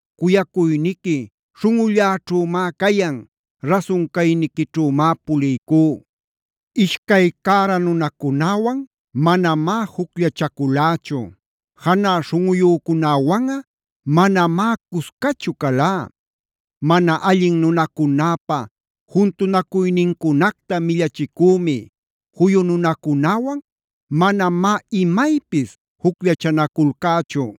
Cuyacuyniqui śhunꞌulläćhümá cayan. Rasun cayniquićhümá puliycú. Ishcay cära nunacunäwan manamá jucllachaculächu. Janä śhunꞌuyücunäwanꞌa manamá cuscachu calá. Mana allin nunacunäpa juntunacuynincunacta millachicümi. Juyu nunacunäwan manamá imaypis jucllachanaculcächu.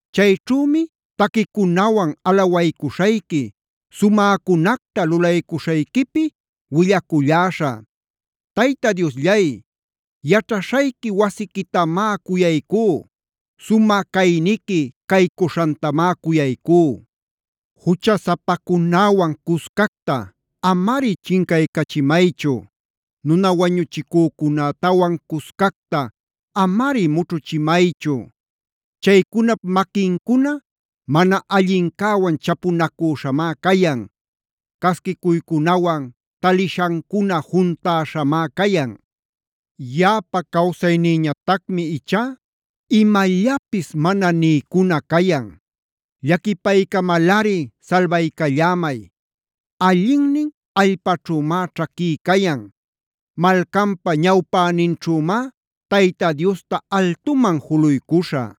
Chayćhümi taquicunawan alawaycuśhayqui, sumäcunacta lulaycuśhayquipi willaculläśhä. Tayta Diosllay, yaćhaśhayqui wasiquitamá cuyaycú. Sumä cayniqui caycuśhantamá cuyaycú. Juchasapacunäwan cuscacta amari chincachimaychu. Nuna wañuchicücunätawan cuscacta amari mućhuchimaychu. Chaycunap maquincuna mana allincäwan chapunacüśhamá cayan. Casquicuycunawan talishancuna juntäśhamá cayan. Yaꞌapa cawsaynïñatacmi ichá imallapis mana niycuna cayan. Llaquipaycamalꞌari salbaycallämay. Allinnin allpaćhümá ćhaquí cayan. Malcanpa ñawpäninćhümá Tayta Diosta altuman juluycuśhä.